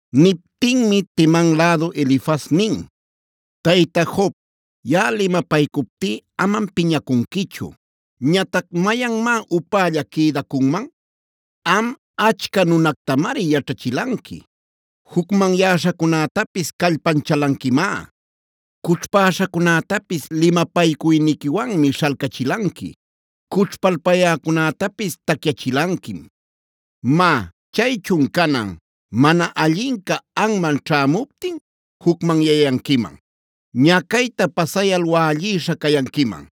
Niptinmi Teman lädu Elifaz nin: “Tayta Job, yaꞌa limapaycuptí amam piñacunquichu. Ñatac ¿mayanmá upälla quïdacunman? Am, achca nunacunactamari yaćhachilanqui; jucmanyäśhacunätapis callpanchalanquimá. Cućhpäśhacunätapis limapaycuyniquiwanmi śhalcachilanqui. Cućhpalpuyäcunätapis tacyachilanquim. Má, chaychun canan, ¿mana allinca anman ćhämuptin jucmanyayanquiman? ¿Ñacayta pasayal wällïsha cayanquiman?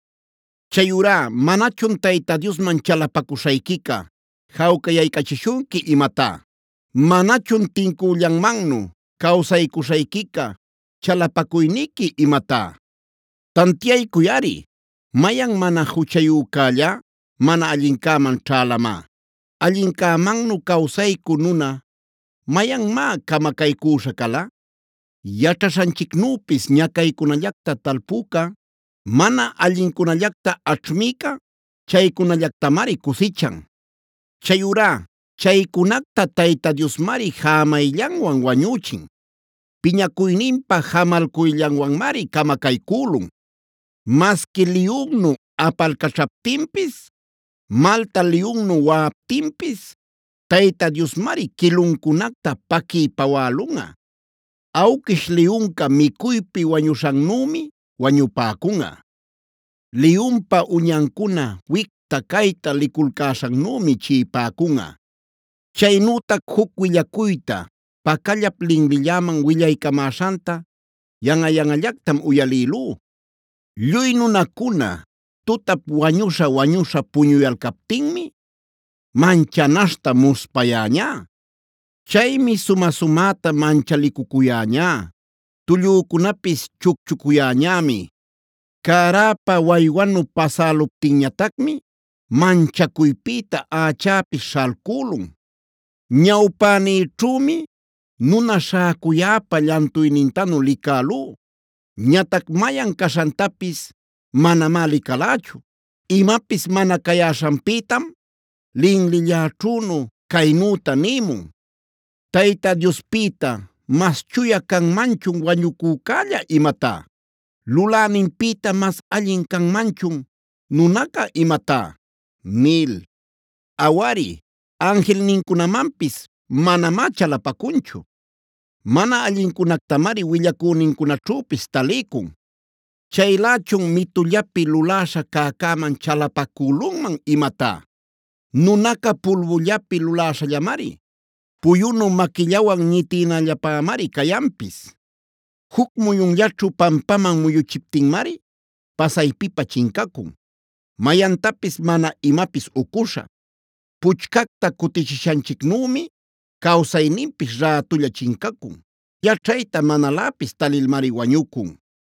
Chayurá ¿manachun Tayta Diosman chalapacuśhayquica jawcayaycachishunqui imatá? ¿Manachun tincüllanmannu cawsaycuśhayquica chalapacuyniqui imatá? “Tantiaycuyꞌari, ¿mayan mana juchayücällá mana allincäman ćhälamá? ¿Allincämannu cawsaycü nuna mayanmá camacaycüśha cala? Yaćhaśhanchicnüpis ñacaycunallacta talpüca, mana allincunallacta aćhmïca chaycunallactamari cusichan. Chayurá chaycunacta Tayta Diosmari jämayllanwan wañüchin. Piñacuyninpa jamalcuyllanwanmari camacaycülun. Masqui liyunnu apalcaćhaptinpis, malta liyunnu waꞌaptinpis Tayta Diosmari quiluncunacta paquiy pawälunꞌa. Awquish liyunca micuypi wañuśhannümi wañupäcunꞌa. Liyunpa uñancuna wicta cayta liculcäśhannümi chiꞌipäcunꞌa. “Chaynütac juc willacuyta pacallap linlilläman willaycamäśhanta yanꞌa-yanꞌallactam uyalïlú. Lluy nunacuna tutap wañuśha-wañuśha puñuyalcaptinmi manchanaśhta muspayäñá. Chaymi sumä-sumäta manchalicucuyäñá. Tullücunapis chucchucuyäñämi. Cäräpa waywanu pasäluptinñatacmi manchacuypïta ächäpis śhalcülun. Ñawpänïćhümi nuna śhäcuyäpa llantuynintanu licälú. Ñatac mayan caśhantapis manamá licalächu. Imapis mana cayäśhanpïtam linlilläćhünu caynüta nïmun: ‘¿Tayta Diospïta mas chuya canmanchun wañucücälla imatá? ¿Luläninpïta mas allin canmanchun nunaca imatá?’ nil. Awari, anjilnincunamanpis manamá chalapacunchu. Mana allincunactamari willacünincunaćhüpis taliycun. Chaylächun ¿mitullapi luläśha cäcäman chalapacülunman imatá? Nunaca pulbullapi luläśhallamari. Puyunu maquillawan ñitïnallapämari cayanpis. Juc muyunllaćhu pampaman muyüchiptinmari pasaypipä chincacun, mayantapis mana imapis ucuśha. Puchcacta cutichishanchicnümi cawsayninpis rätulla chincacun. Yaćhayta manaläpis talilmari wañucun.